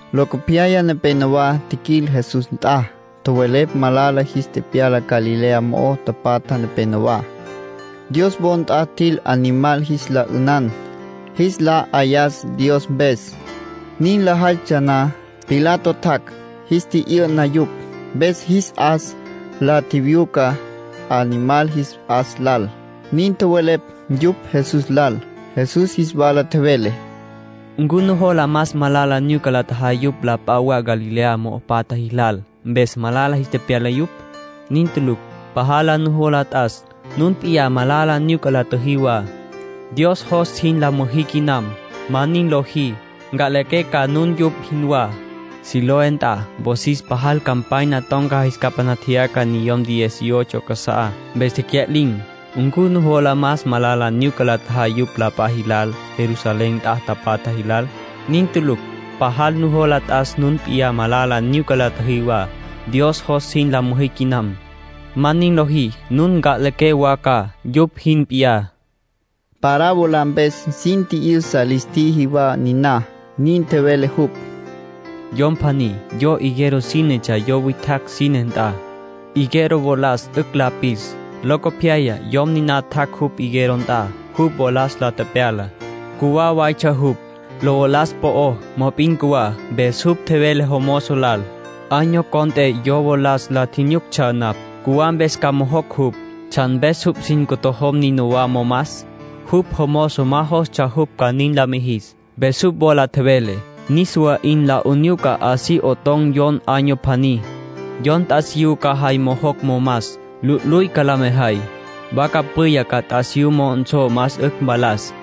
Locopyaya nepénowa tjiquil Jesús nt'a, tjowelepj malala jis tepyala Galilea mo'o tapatja nepenowá. Dios wo nt'a tjil animal jis la 'ünan, jis la 'ayas Dios mpes. Nin lajaytsja na, Pilato tjac', jis tji'yü'na yupj, mpes jis 'as la tjiwyuca animal jis 'as lal. Nin tjowelepj yupj Jesús lal. Jesús jis wala tjevele: “¿Ncu nujola más malala nyuca la tjajay yupj la p'a wa Galilea mo'o tapatja jilal, mpes malala jis tepyala yupj? Nin tulucj. Pajal nujola t'as nun p'iyá malala nyuca la tjüjí wa. Dios jos jin la müjí quinam. Ma nin lojí, nca'liqué ca nun yupj jinwá. Siloé nt'a, wosis pajal campanya ton̈ca jis capaná tjeyaca niyom diez y ocho casa'á, mpes tecya'lin̈. ¿Ncu nujola más malala nyuca la tjajay yupj la p'a jilal, Jerusalén nt'a patja jilal? Nin tulucj. Pajal nujola t'as nun p'iyá malala nyuca la tjüjí wa. Dios jos jin la müjí quinam. Ma nin lojí, nun nca'liqué wa ca, yupj jin p'iyá”, tjevele Jesús. Parábola mpes sin tji'yüsa lis tjiji wa niná. Nin tjevele jupj: “Yom pjaní yo higuera sínetsja yo witjacj sine nt'a. (Higuera wolas 'ücj la pis.) Locopyaya yom niná tjac' jupj higuera nt'a, jupj wolas la tepyala. Cjuwá waytsja jupj. Lo valas po'ó, mop'in cjuwá. Mpes jupj tjevele jomozo lal: ‘Año cont'e yo wolas la tjinyuctsja napj. Cjuwá. Mpes ca mojocj jupj. ¿Tsjan mpes jupj sin ntojom nínawa momas?’ Jupj jomozo ma jostsja jupj ca nin la mijis. Mpes jupj wola tjevele: ‘Niswa 'in la 'unyuca así 'oton̈ yon año pjaní. Yon t'asiyú ca jay mojocj momas, lu'luy ca la mejay. Vaca pwiya'a ca t'asiyú mo'onsó más 'ücj mvalas.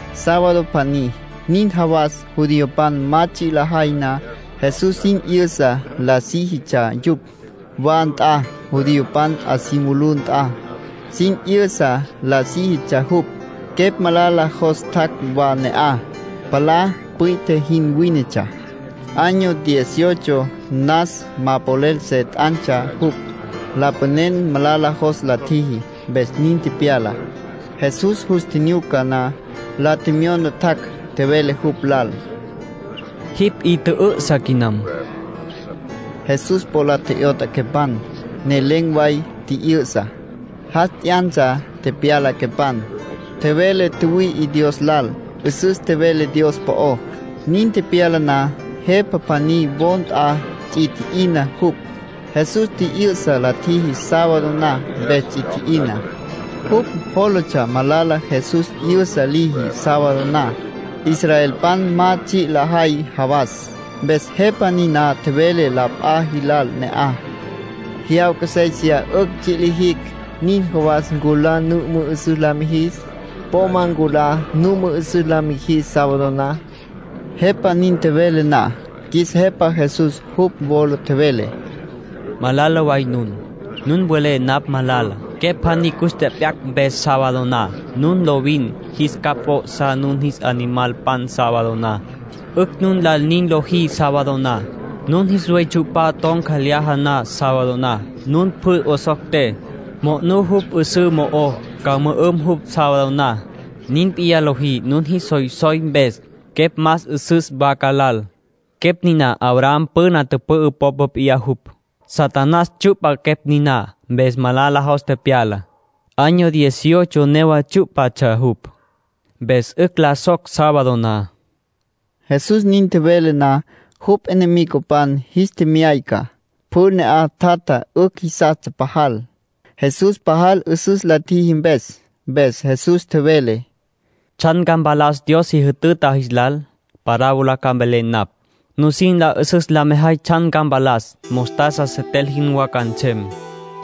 Sábado pjaní, nin jawas judiopan ma tsji' lajay na, Jesús sin 'yüsa la síjitsja yupj. Wa nt'a, judiopan 'a si mulú nt'a, sin 'yüsa la síjitsja jupj. Quepj malala jos tjac' wa ne'aj. Palá palá pwi'tje jin wínetsja. Año diez y ocho nas ma polel se t'antsja jupj. Lapanen malala jos la tjiji, mpes nin tepyala. Jesús jus tjinyuca na, la tjemyona tjac'. Tjevele jupj lal: —Jipj 'i tjü'ü'sa quinam. Jesús po la tje'yot'a quepan, ne len̈ way tji'yü'sa. Jas t'yantsja tepyala quepan. Tjevele tjüwüi'i Dios lal, 'üsüs tjevele Dios po'ó. Nin tepyala na, jepa pjaní wo nt'a ts'i tji'ina jupj. Jesús tji'yü'sa la tjiji sábado na, mpes ts'i tji'ina. Jupj jólatsja malala Jesús 'yü'sa liji sábado na, israelpan ma tsji' lajay jawas. Mpes jepa niná tjevele la p'a jilal ne'aj: —Jyawca séisiya 'ücj tsji' lijicj. Nin jawas nculá nu mü'ü'süs la mijis. Po ma nculá nu mü'ü'süs la mijis sábado na. Jepa nin tjevele na, qjuis Jepa Jesús jupj wola tjevele: —Malala way nun. Nun welé napj malala, quepj pjaní cus tjep'yacj mpes sábado na. Nun lovin jis capj p'o'sá nun jis animalpan sábado na. 'Ücj nun lal nin lojí sábado na. Nun jis buey tsyu'pa ton̈ca lyaja na sábado na, nun pjü 'osocté, monú jupj 'üsǘ mo'ó, ca mü'üm jupj sábado na. Nin p'iyá lojí nun jis soysoy mpes. Quepj más 'üsüs vaca lal. Quepj niná Abraham püna tüpü'ü popa p'iyá jupj. Satanás tsyu'pa quepj niná, mpes malala jos tepyala. Año diez y ocho newa tsyú'patsja jupj. Mpes 'ücj la soc sábado na. Jesús nin tjevele na, jupj enemigopan jis tjemyayca. Pjü ne'aj tjatja 'ücj jisastsja pajal, Jesús pajal 'üsüs la tjiji mpes. Mpes Jesús tjevele: —¿Tsjan ca mpalas Dios si jütüta jis lal? Parábola ca mvelé napj, nusin la 'üsüs la mejay tsjan ca mpalas. Mostaza setel jinwá ca nsem.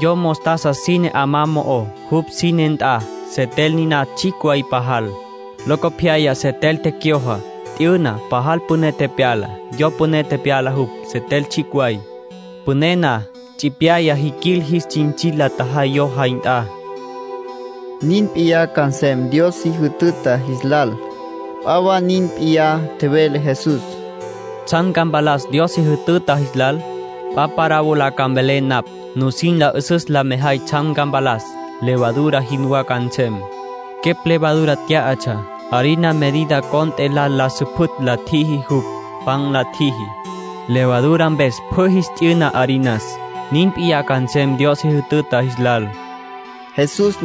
Yom mostaza sine 'amá mo'ó, jupj sine nt'a. Setel niná tsjicj way pajal. Locopyaya setel tecyojo, t'yüna, pajal püné tepyala. Yo püné tepyala jupj, setel tsjicj way. Püné na, tsipyaya tjiquil, jis tsintsil la tjajay yo jay nt'a. (Nin p'iyá ca nsem Dios si jütüta jis lal.) P'a wa nin p'iyá tjevele Jesús: —¿Tsjan ca mpalas Dios si jütüta jis lal? P'a parábola ca mvelé napj, nusin la 'üsüs la mejay tsjan ca mpalas. Levadura jinwá ca nsem. Quepj levadura tyá'atsja. Harina medida cont'e lal la süpjütj la tjiji jupj, pan la tjiji. Levadura mpes pjü jis t'yüna harinas. Nin p'iyá ca nsem Dios si jütüta jis lal —nin tjevele Jesús.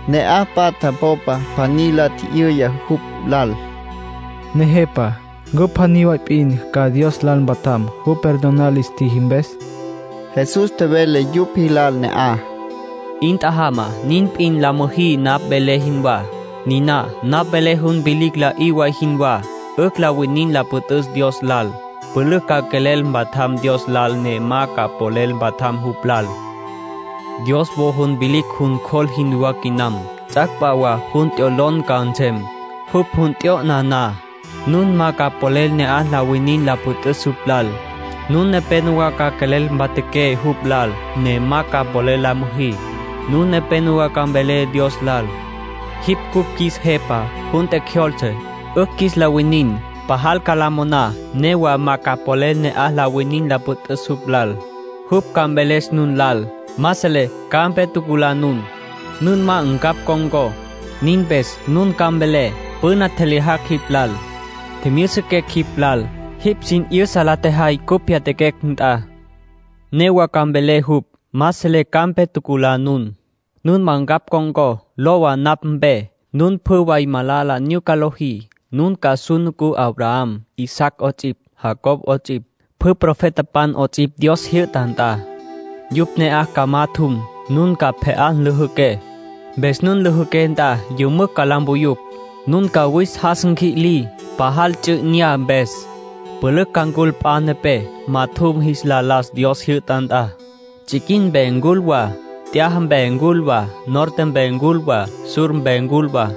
Ne'aj patja popa pjaní la tji'yüya jupj lal: —Nejepa ¿ncu pjaní way p'in ca Dios lal mpatjam, jupj perdonar lis tjiji mpes? Jesús tjevele yupj jilal ne'aj: —'In tjajama nin p'in la müjí napj velé jinwá. Niná napj velé jun vilicj la'í way jinwá, 'ücj la winin la püt'üs Dios lal. Pülücj ca quelel mpatjam Dios lal ne ma ca polel mpatjam jupj lal. Dios wo jun vilicj jun cjol jinwá quinam. Ts'ac' p'a wa jun t'yolon ca nsem. Jupj jun t'yo'na na, nun ma ca polel ne'aj la winin la püt'üs jupj lal. Nun nepenowá ca quelel mpatjaqué jupj lal, ne ma ca polel la müjí. Nun nepenowá ca mvelé Dios lal: ‘Jipj cupj qjuis Jepa. Jun tjecjyoltse, 'ücj qjuis la winin.’ Pajal ca la moná, newa ma ca polel ne'aj la winin la püt'üs jupj lal. Jupj ca mveles nun lal: ‘Ma selé ca'aj mpe tjuculá nun. Nun ma ncapj con̈có.’ Nin mpes nun ca mvelé: ‘Püna tjelyajacj jipj lal. Tjimyüsiquecj jipj lal. Jipj sin 'yüsa la tjejay cupj pyatjaquecj nt'a.’ Newa ca mveles jupj: ‘Ma selé ca'aj mpe tjuculá nun. Nun ma ncapj con̈có. Lowa napj mpe. Nun pjü way malala nyuca lojí.’ ”Nun ca su nucú Abraham, Isaac 'ots'ipj, Jacob 'ots'ipj, pjü profetapan 'ots'ipj Dios jyü'ta nt'a. Yupj ne'aj ca majatjum. Nun ca pje'á lüjüqué, mpes nun lüjüqué nt'a yümücj ca la mpuyú. Nun ca wis jas nqui'lí, pajal ts'u 'inyá mpes. Pülücj ca ncul p'a nepé, majatjum jis la las Dios jyü'ta nt'a. Tsiquin mpe ncul wa, t'yaja mpe ncul wa, norte mpe ncul wa, sur mpe ncul wa.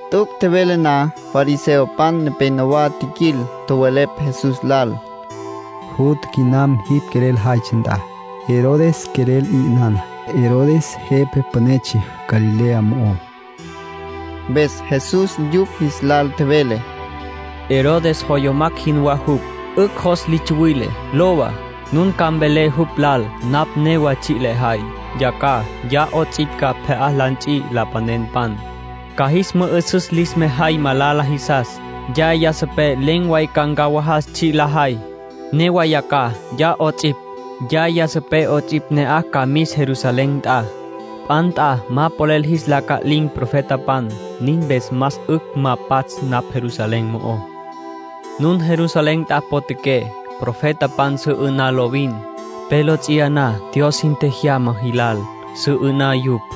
T'üc' tjevele na, fariseopan nepénowa tjiquil, tjowelepj Jesús lal: —Jutja quiyam jipj quelel jaytsja nt'a. Herodes quelel 'i 'ünana. (Herodes jepa pünetsja Galilea mo'ó.) Mpes Jesús yupj jis lal tjevele: —Herodes joyomac' jinwá jupj. 'Ücj jos li tsuwile. Lowa, nun ca mvelé jupj lal napj newa tsji' lejay. Yacjaj, ya 'ots'ipj ca pje'á la nts'i lapanenpan, ca jis mü'ü'süs lis mejay malala jisas. Yaya sipé len̈ way ca ncawajas tsji' lejay. Newa yacjaj, ya 'ots'ipj, yaya sipé 'ots'ipj ne'aj ca mis Jerusalén nt'a. P'a nt'a ma polel jis la ca'lin̈ profetapan. Nin mpes más 'ücj ma pats' napj Jerusalén mo'ó. ”Nun Jerusalén nt'a potjaqué, profetapan su 'ü'ná lovin. Pe lo ts'iyaná Dios sin tjejyama jilal, su 'ü'ná yupj.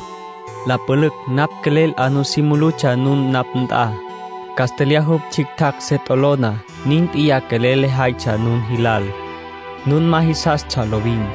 La pülücj napj quelel 'a nusí mulutsja nun napj nt'a. Castlyaj jupj tsjictjacj se t'olona, nin p'iyá quelel lejaytsja nun jilal. Nun ma jisastsja lovin.